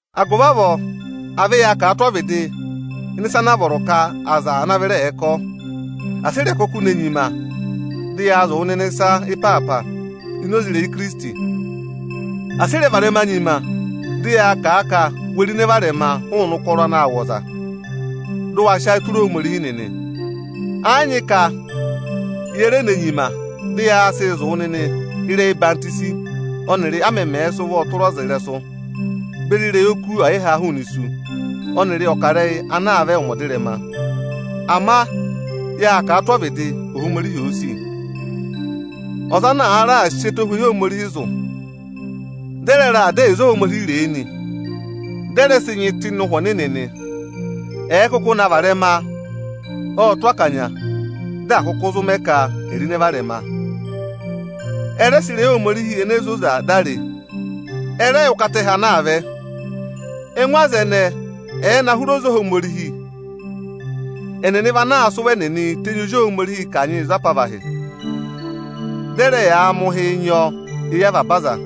Agụvị avọọ, à vẹ yaa kà a tụ́ ọvịdị ịnị ịsa ana a vọrọ ka aza ana vịra ẹ̀ẹ kọ! Asị i re kuku ne nyima dị yaa zụ̀ wụ nịnị ịsa ịpaapa ini oze ịrẹyị Ikirisiti! Asị ị rẹ varẹma nyima dị yaa kà a ka we ro ịnẹ varẹma hụụnị ụkọrọ anaā wụ̀ ọza, dị ụ wa sị ayị tụra Ohomorihi nịnị! Ẹ́ yị nyị ka ye re ne nyima dị yaa zụ̀ wụ nịnị ịrẹyị ọyịhwọzenyi, ọnịrị a mẹmẹẹ̄ sị ụvọọ tụra ọza ịrẹsụ, beri ịrẹyị oku ọyị ha hụụnị isu, ọnịrị ọkarẹyị anaa vẹ ụmẹ ọdịrẹma. Ama yaa kà a tụ́ ọvịdị, Ohomorihi òo sì. Aza ana àa raà sị ẹtohweyi Ohomorihi zụ̀, dị ẹ rẹ raà dá ẹyịza Ohomorihi ree nị, dị ẹ rẹ sị nyị tụ́ ịnị Ụhwẹ Ọnịnị nị, ẹ̀ẹ kụkụ na varẹma, ọ́ọ tụ́ akanya dị à kụkụ zụ mẹ ka e rọ ịnẹ varẹma. Ẹ rẹ sị ịrẹyị Ohomorihi ene zoza dá ree ẹ rẹ yẹ ụkata ẹhẹ anaa vẹ. Ẹngụ aza ẹnẹẹ ẹ̀ ẹ na hụrị oze Ohomorihi, ẹnịnị vị anaa sị ụvọ ẹnịnị tenyi Ozi Ohomorihii kanyịị za apavahị. Dị ẹ rẹẹ yaa mẹ ụhịị nyị ọ eyi avaba aza.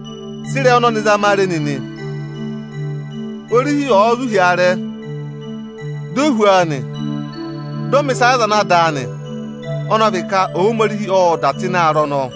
Sị ịrẹyị ọnọnị zama a re nịnị: Orihi ọ̀ọ zụ̀ hi aarẹ, di o hú ọọ, dị ọ mẹ̀ ịsa yị aza ana dàa nị, Ohomorihiī mẹ ọyịzaa yị ẹtẹ ọnọọ.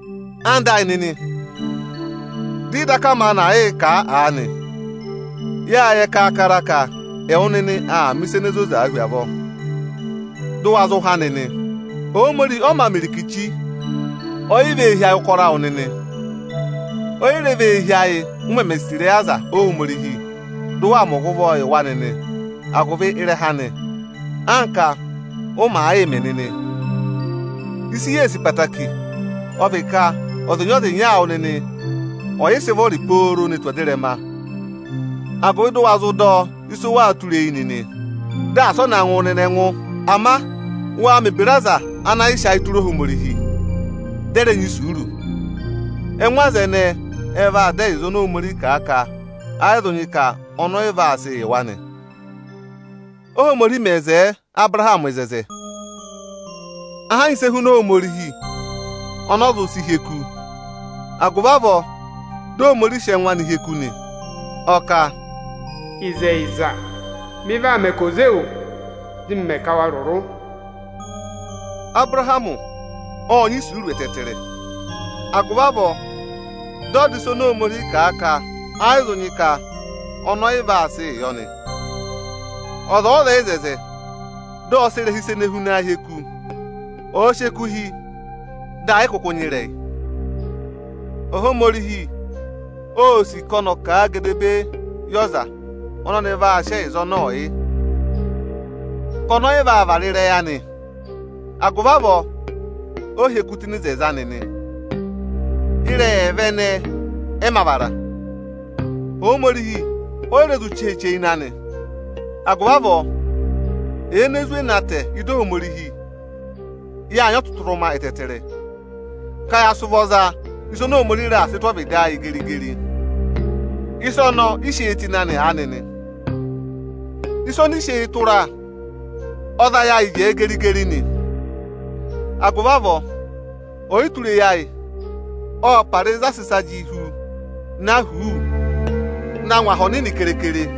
Ẹwụ nịnị ẹyịnyara amị, dị ị daka maanị aà yịị kà a aanị, yâ yẹ kaakara ka ẹwụ nịnị aa mẹ̀ ịsa ene zozaa hu avọọ, dị ụ wa há nịnị. Ohomorihi ọ ma mẹ irikichi. O yi vee hi ayị ụkọrọ awụ nịnị. O yi re vee hi ayị, u meme sì ịrẹyị aza Ohomorihi, dị ụ waa gụ wa ụvọ nịnị agụvị ịrẹha anị, anka ụ màa yịị mẹ nịnị. Ịsị yee sìi hu, ọ vị ka, ọzịnya-ọzịnya awụ nịnị ọ̀ yịị sịị vụrị pooro ne tù ọdịrẹma, agụvị dị ụ wa zụ dọ ịsị ụ waa tụra eyi anị nịnị, dị asị ọ na ngụ wụ nịnị ẹngụ. Ama waa mẹ̀ ebira, aza ana yịị sị ayịị tụra Ohomorihi, dị ẹ rẹ nyị isuuru. Ẹngụ aza ẹnẹẹ ẹ vaa dọ ẹyịza oni Ohomorihi kà a ka ẹyị zụ nyị ka ọnị ọyị vaa sịị yị wa nị. Óhomorihi me wo oto yị Abụrahamị, ẹ yị nyị ịsị e huna Ohomorihi ọnị ọ zụ sị hị́ eku, agụvị avọọ dị Ohomorihi sị ẹngụ anị hị́ eku nị. Ọ kà, Ịzẹyịza, ọnị vaa mẹ ka ò ze yọ, dị ọnị mẹ ka evere anị ẹ̀ rụrụ. Abụrahamị ộ nyị isuuru ẹtẹẹtẹrẹ, agụvị avọọ dị ọ dọ ịsa oni Ohomorihi kà a ka ẹ́ yị zụ nyị ka ọnị ẹyị vaa sịị yọ nị. Ọza ọ̀ọ wo oto, dị ọ sị ịrẹha ịsa ene hunaa hị́ eku. Ọ̀ọ sị eku hị́, dị ẹ yị kụkụ nyị ịrẹyị. Ohomorihi óo sì ka ọnị ọ̀ kà a gedebee yị ọza ọnị ọnị vaa sị ẹyịza ọnọọ yị, ka ọnị ọ yị vaa vara ịrẹyị anị. Agụvị avọọ ọ hị́ eku tụ́ ịnị oto anị nị. Ịrẹyị ẹẹva ẹnẹẹ ẹ mā vara. Ohomorihi oyi re zụ cheeche ịnị anị. Agụvị avọọ, ẹyị ene zwe na tẹ̀ ịdị anị, yaa nyị ọtụtụrụma ẹtẹẹtẹrẹ ka ya sị ụvọ za oni Ohomorihi raà sị tụ́ ọvịdị ayị geri-geri. Ịsa ọnọọ ị sị eyi tụ́ ịnị anị nị. Ịsa ọnị ị sị eyi tụra, ọ za ayị ayị jẹẹ geri-geri nị. Agụvị avọọ, ọyịtureyi ayị ọ́ọ para ịzị a sị ịsa jị hu na huuu na ngụ aha ọnịnị keekere.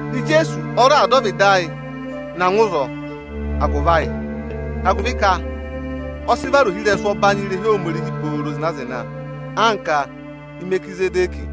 Ijeesu ọ raà dọ ọvịdị na ngụ ịzọọ agụvị ayị, agụvị ka ọ sị vara ohirẹsụ ọbanyị irehi Ohomorihi pooro zịna-zịna anka Imerikizẹdẹkị.